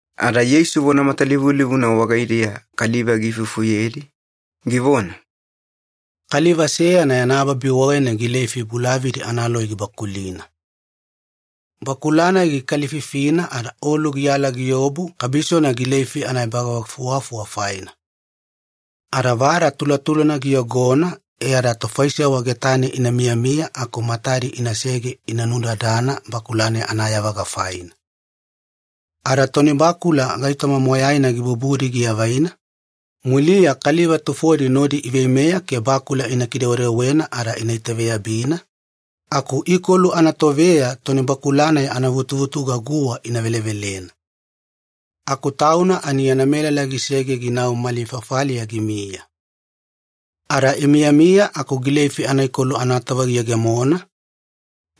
Ada Yeisu vona matalivulivuna wagaidiya kaliva giifufuyedi, givona, “Kaliva seyana yana babi wagaine gileifi bulavadi analoi gibakulina. Bakula-nai gikalififina ada olu giyala giobu kabisona gileifi anaebavagafuwafuwa faina. Ada vada tulatulana giyogona e ada tofaisewa getane ina miyamiya aku matadi inasege ina nudadana bakula-nai anayavaga faina. Ada toni bakula gaitoma moyaina gibubudi giavaina, muliya kaliva tufodi nodi iveimeya ke bakula ina kidewedewena ada ina itaveyabina, aku ikolu anatoveya toni bakula-nai anavutuvutuga guwa ina velevelena. Aku tauna ani yana melala gisege ginau mali fafaliya gimiya. Ada imiyamiya aku gileifi anaikolu anatova giyegemona,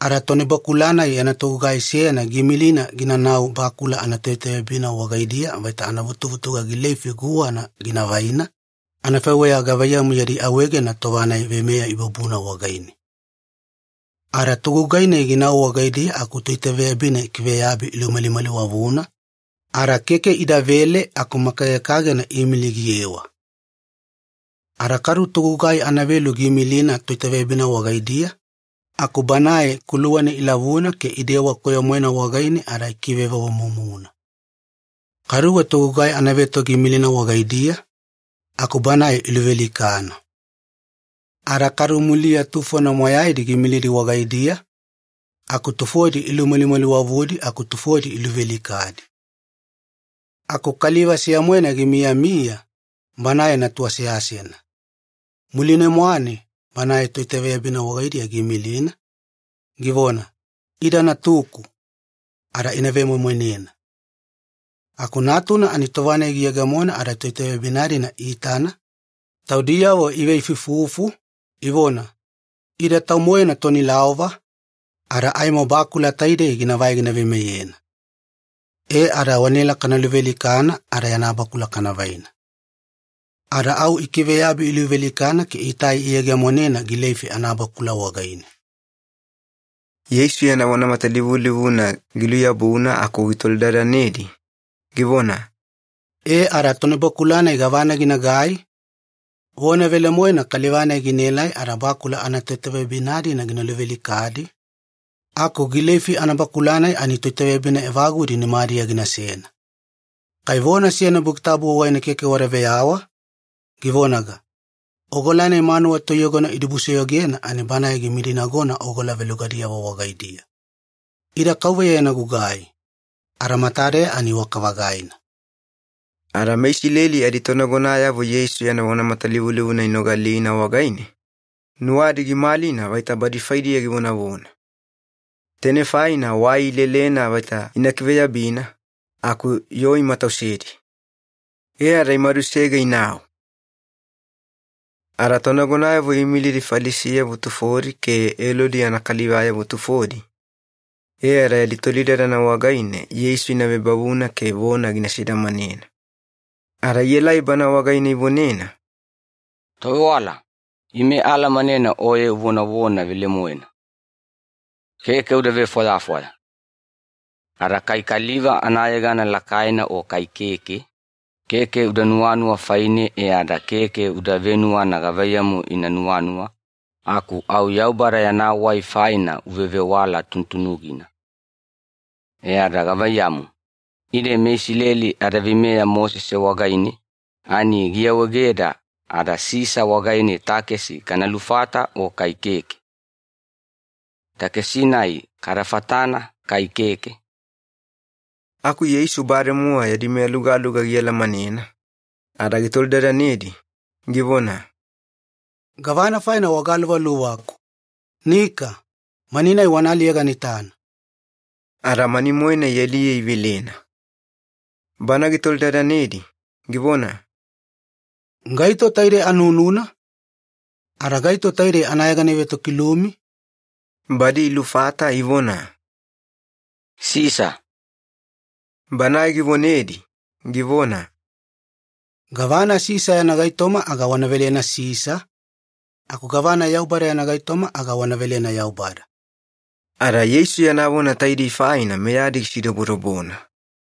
ada tonibakula-nai yana togugai seyana giimilina ginanau bakula anatoitaveyabina wagaidiya vaita anavutuvutuga gileifi guwana gina vaina, anafaiweya gavaiyamu yadi awaegena tova-nai veimeya ibubuna wagaine. Ada togugai-nai ginau wagaidiya aku toitaveyabina ikiveyabi ilumalimaliwavuna, ada keke idavele aku makagekagena iimili giyewa. Ada kadu togugai anavelu giimilina toitaveyabina wagaidiya, aku banae kuluwana ilavuna ke idewa koyo-moena wagaine ada ikivevovomumuna. Kaduwe togugai anaveto giimilina wagaidiya, aku banae iluvealikana. Ada kadu muliya tufona moyaidi giimilidi wagaidiya, aku tufodi ilumalimaliwavudi aku tufodi iluvealikadi. Aku kaliva seya-moena gimiyamiya, banae natu aseasena. Muline-mwane banae toitaveyabina wagaidiya giimilina, givona, ‘Ida natuku, ada ina vemoimoinena.’ “Aku natuna ani tova-nai giyegemona ada toitaveyabina-dina iitana, taudiyavo iveifuifufu, ivona, ‘Ida tau-moena toni laova, ada aimo bakula taidei ginavai gina veimeyena. E ada wanaela kana luvealikana ada yana bakula kana vaina.’ Ada au ikiveyabi iluvealikana ke itai iyegemonena gileifi anabakula wagaine.” Yeisu yana vona matalivulivuna giluyabuna aku gitolidadanedi, givona, “E ada tonibakula-nai gavana ginagai? Vona velemoena kaliva-nai ginaelai ada bakula anatoitaveyabina-dina gina luvealikadi, aku gileifi anabakula-nai ani toitaveyabina evagudi nimadiya ginasena. Kai vona seyana Buki Tabu wagaine keke wada veyawa, givonaga, ‘Ogola-nai manuwa toiyogona idibusoyogena ani banae gimidinagona ogola velugadiyavo wagaidiya. Ida KAUVEYA yana gugai, ada matadeya ani iwaka-vagaina.’” Ada meIsileli aditonagonayavo Yeisu yana vona matalivulivuna inogalina wagaine, nuwadi gimalina vaita badi faidiya givonavona. Tainei faina wai ilelena vaita ina kiveyabina, aku yoo imatausedi. E ada imadusege inau. Ada tonagonayavo iimilidi Falisiyavo tufodi ke Elodi yana kalivayavo tufodi, e ada yadi tolidadana wagaine Yeisu ina vebavuna ke vona gina sidamanena. Ada ielai Bana wagaine ivonena, “Tovewala, ime aalamanena Oye uvonavona velemoena. Keke uda vefwayafwaya. Ada kai kaliva anayegana lakaina o kai keke, keke uda nuwanuwa faine e ada keke uda venuwana gavaiyamu ina nuwanuwa, aku au Yaubada yana wai faina uvevewala tunutunugina. E ada gavaiyamu, ide meIsileli adaveimeya Mosese wagaine, ani giawaegeda ada Sisa wagaine takesi kana lufata o kai keke? Takesi-nai kada fatana kai keke?” Aku Yeisu bademowa yadi meyalugaluga gialamanena, ada gitolidadanedi, givona, “Gavana faina wagaluvaluvaku? Nika, mani-nai wana aliye gana itana.” Ada mani-moena ialiye ivelena. Bana gitolidadanedi, givona, “Gaito taidei anununa? Ada gaito taidei anayegana ivetokilumi?” Badi ilufata ivona, “Sisa.” Banae givonedi, givona, “Gavana Sisa yana gaitoma aga wana velena Sisa, aku gavana Yaubada yana gaitoma aga wana velena Yaubada.” Ada Yeisu yana vona taidei faina meyadi gisidobodobona.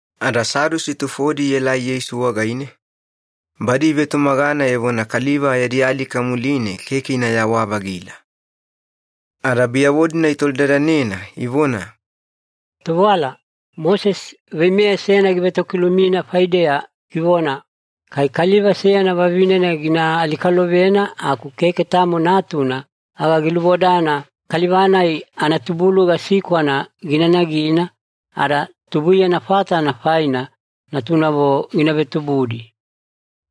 Ada Sadusi tufodi ielai Yeisu wagaine, badi ivetumagana evona kaliva yadi alika muline keke inayawa-vagila. Ada biyavo-dina itolidadanena ivona, “Tovewala, Mosese veimeya seyana givetokilumina faideya givona, Kai kaliva seyana vavinena gina alikalovena aku keke tamo natuna, aga gilubodana kaliva-nai anatubuluga sikwana gina nagina, ada tubuiyana fatana faina natunavo gina vetubudi.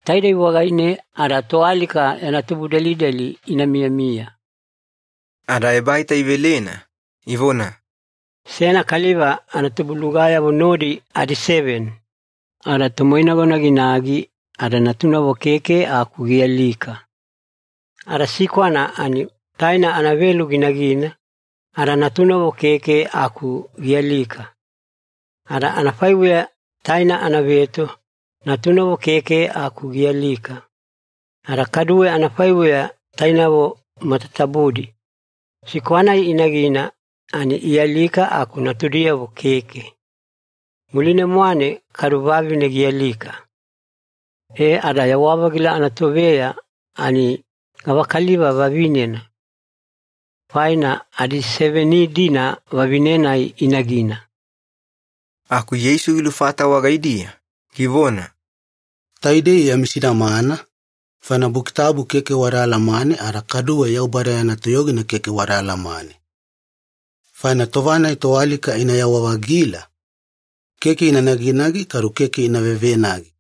Taidei wagaine ada toalika yana tubudelideli ina miyamiya.” Ada ebaita ivelena, ivona, “Seyana kaliva anatubulugayavo nodi adiseveni. Ada tomoinagona ginagi ada natunavo keke aku gialika. Ada sikwana ani taina anavelu ginagina, ada natunavo keke aku gialika. Ada anafaiweya taina anaveto, natunavo keke aku gialika. Ada kaduwe anafaiweya tainavo matatabudi, sikwa-nai inagina ani ialika aku natudiyavo keke. Muline-mwane kadu vavine gialika. E ada yawa-vagila anatoveya ani gavakaliva vavinena? Faina adiseveni-dina vavine-nai inagina.” Aku Yeisu gilufata wagaidiya, givona, “Taidei yami sidamana, faina Buki Tabu keke wada alamane ada kaduwe Yaubada yana toyogina keke wada alamane. Faina tova-nai toalika inayawa-vagila, keke ina naginagi kadu keke ina vevenagi,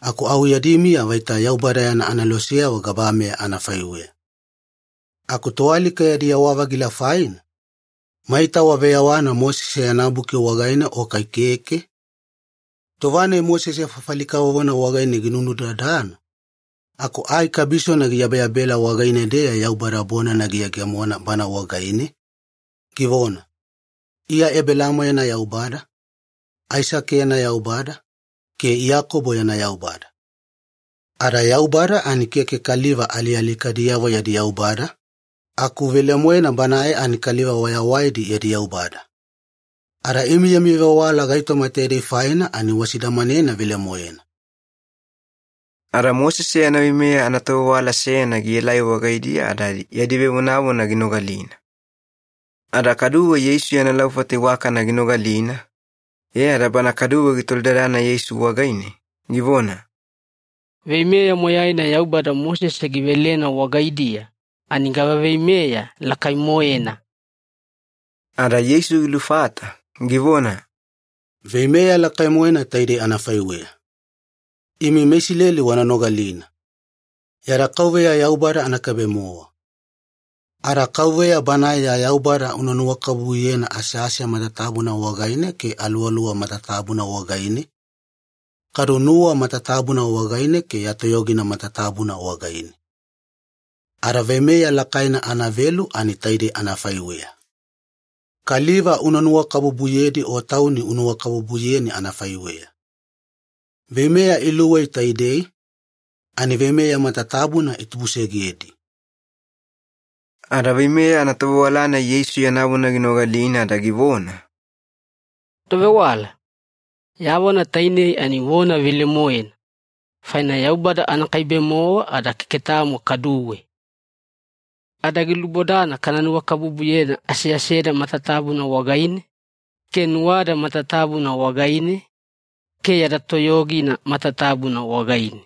aku au yadi miya vaita Yaubada yana aneloseyavo gabameya anafaiweya. Aku toalika yadi yawa-vagila faina, maita waveyawana Mosese yana buki wagaine o kai keke? Tova-nai Mosese fafali kavovona wagaine ginunudadana, aku ai kabisona giyabeyabela wagaine-deya Yaubada bonana giyegemona bana wagaine, givona, ‘Iya Ebelaamo yana Yaubada, Aisake yana Yaubada, ke Iyakobo yana Yaubada.’ Ada Yaubada ani keke kaliva alialikadiyavo yadi Yaubada, aku velemoena Banae ani kaliva wayawaidi yadi Yaubada. Ada imi yami vewala gaitoma taidei faina ani wasidamanena velemoena.” Ada Mosese yana veimeya anatovewala seyana gielai wagaidiya ada yadi vevonavona ginogalina. Ada kaduwe Yeisu yana laufata iwakana ginogalina, e ada bana kaduwe gitolidadana Yeisu wagaine, givona, “Veimeya moyaina Yaubada Mosese givelena wagaidiya ani gava veimeya lakai-moena?” Ada Yeisu gilufata, givona, “Veimeya lakai-moena taidei anafaiweya. ‘Imi meIsileli wana nogalina. Yada KAUVEYA Yaubada anakaibe-mowa. Ada KAUVEYA Banae ya Yaubada una nuwakabubuyena asease matatabuna wagaine ke aluwaluwa matatabuna wagaine, kadu nuwa matatabuna wagaine ke ya toyogina matatabuna wagaine.’ Ada veimeya lakaina anavelu ani taidei anafaiweya. ‘Kaliva una nuwakabubuyedi o tauni unuwakabubuyeni anafaiweya.’ Veimeya iluwei taidei, ani veimeya matatabuna itubusegedi.” Ada veimeya anatovewala-nai Yeisu yana vona ginogalina ada givona, “Tovewala, ya vona tainei ani vona velemoena, faina Yaubada anakaibe-mowa ada keke tamo kaduwe. Ada gilubodana kana nuwakabubuyena aseaseda matatabuna wagaine, ke nuwada matatabuna wagaine, ke yada toyogina matatabuna wagaine.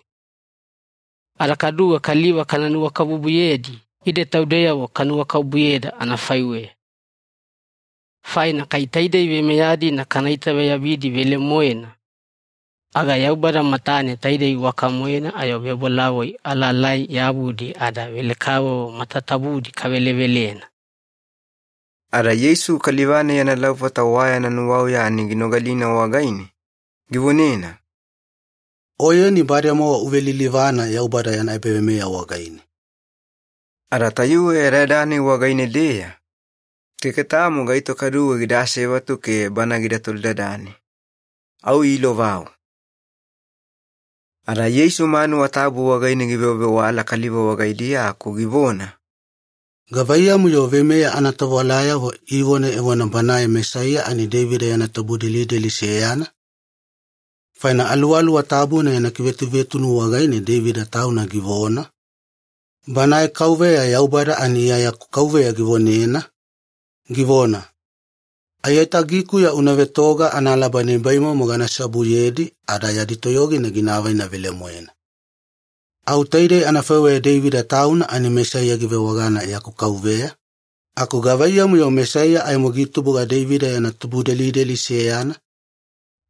Ada kaduwe kaliva kana nuwakabubuyedi ide taudeyavo kanuwakabubuyeda anafaiweya. Faina kai taidei veimeya-dina kana itaveyabidi velemoena, aga Yaubada matane taidei iwaka-moena ayo vebolavoi alaalai-yabudi ada velekavovo matatabudi kavelevelena.” Ada Yeisu kaliva-nai yana laufata wa yana nuwauya ani ginogalina wagaine, givonena, “Oyeni bademowa uvelilivana Yaubada yana ebaveimeya wagaine.” Ada tayuwe yadayada-nai wagaine-deya, keke tamo gaito kaduwe gida asevatu ke Bana gida tolidadane. Au iilovau. Ada Yeisu manuwa tabu wagaine givewavewala kaliva wagaidiya aku givona, “Gavaiyamu-yo veimeya anatovewalayavo ivona evona Banae Mesaiya ani Deivida yana tubudelideli seyana? Faina Aluwaluwa Tabuna yana kivetuvetunu wagaine Deivida tauna givona, ‘Banae KAUVEYA Yaubada ani Iya yaku Kauveya givonena, givona, “Aiyatagikuya una vetoga analaba nibaimomo gana seobuyedi ada yadi toyogina gina avaina velemoena.”; Au taidei anafaiweya Deivida tauna ani Mesaiya givewagana ‘yaku Kauveya’, aku gavaiyamu-yo Mesaiya aimo gitubuga Deivida yana tubudelideli seyana?”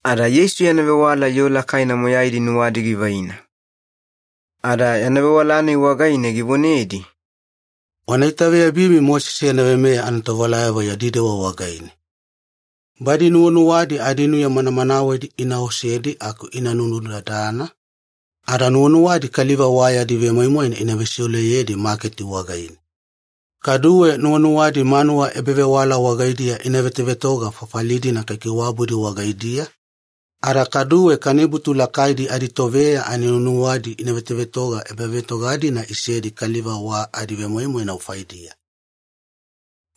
Ada Yeisu yana vewala yoo lakaina moyaidi nuwadi givaina. Ada yana vewala-nai wagaine givonedi, “Wana itaveyabimi Mosese yana veimeya anatovewalayavo yadi dewa wagaine. Badi nuwanuwadi adinuya manamanawedi ina osedi aku ina nunudadana, ada nuwanuwadi kaliva wa yadi vemoimoina ina vesiuleyedi maketi wagaine. Kaduwe nuwanuwadi manuwa ebavewala wagaidiya ina vetovetoga fafali-dina kaikaiwabudi wagaidiya, ada kaduwe kanibutu lakaidi aditoveya ani nuwanuwadi ina vetovetoga ebavetoga-dina isedi kaliva wa adivemoimoina faidiya.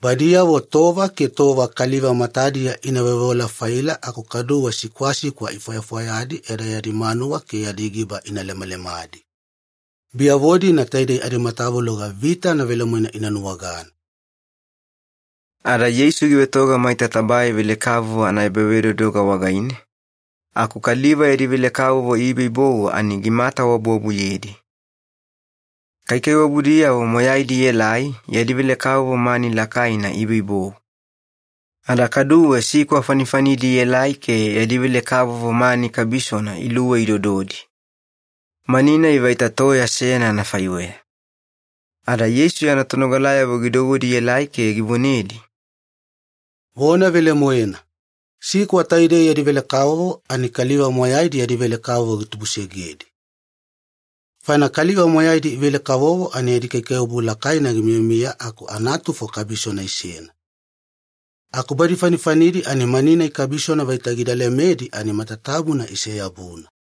Badiyavo tova ke tova kaliva matadiya ina veoveola-faila aku kaduwe sikwasikwa ifwayafwayadi e ada yadi manuwa ke yadi giba ina lemalemadi. Biyavo-dina taidei adimatavuloga vitana velemoena ina nuwagana.” Ada Yeisu givetoga maita tabae velekavovo anaebavedodoga wagaine, aku kaliva yadi velekavovo iboibou ani gimatawabuwabuyedi. Kaikaiwabudiyavo moyaidi ielai yadi velekavovo mani lakaina iboibou. Ada kaduwe sikwa fanifanidi ielai ke yadi velekavovo mani kabisona iluwei idododi. Mani-nai vaita toya seyana anafaiweya. Ada Yeisu yana tonogalayavo gidouwedi ielai ke givonedi, “Vona velemoena, sikwa taidei yadi velekavovo ani kaliva moyaidi yadi velekavovo gitubusegedi. Faina kaliva moyaidi ivele-kavovo ani yadi kaikaiwabu lakaina gimiyamiya aku anatufo kabisona isena. Aku badi fanifanidi ani mani-nai kabisona vaita gida lemedi ani matatabuna ise-yabuna.”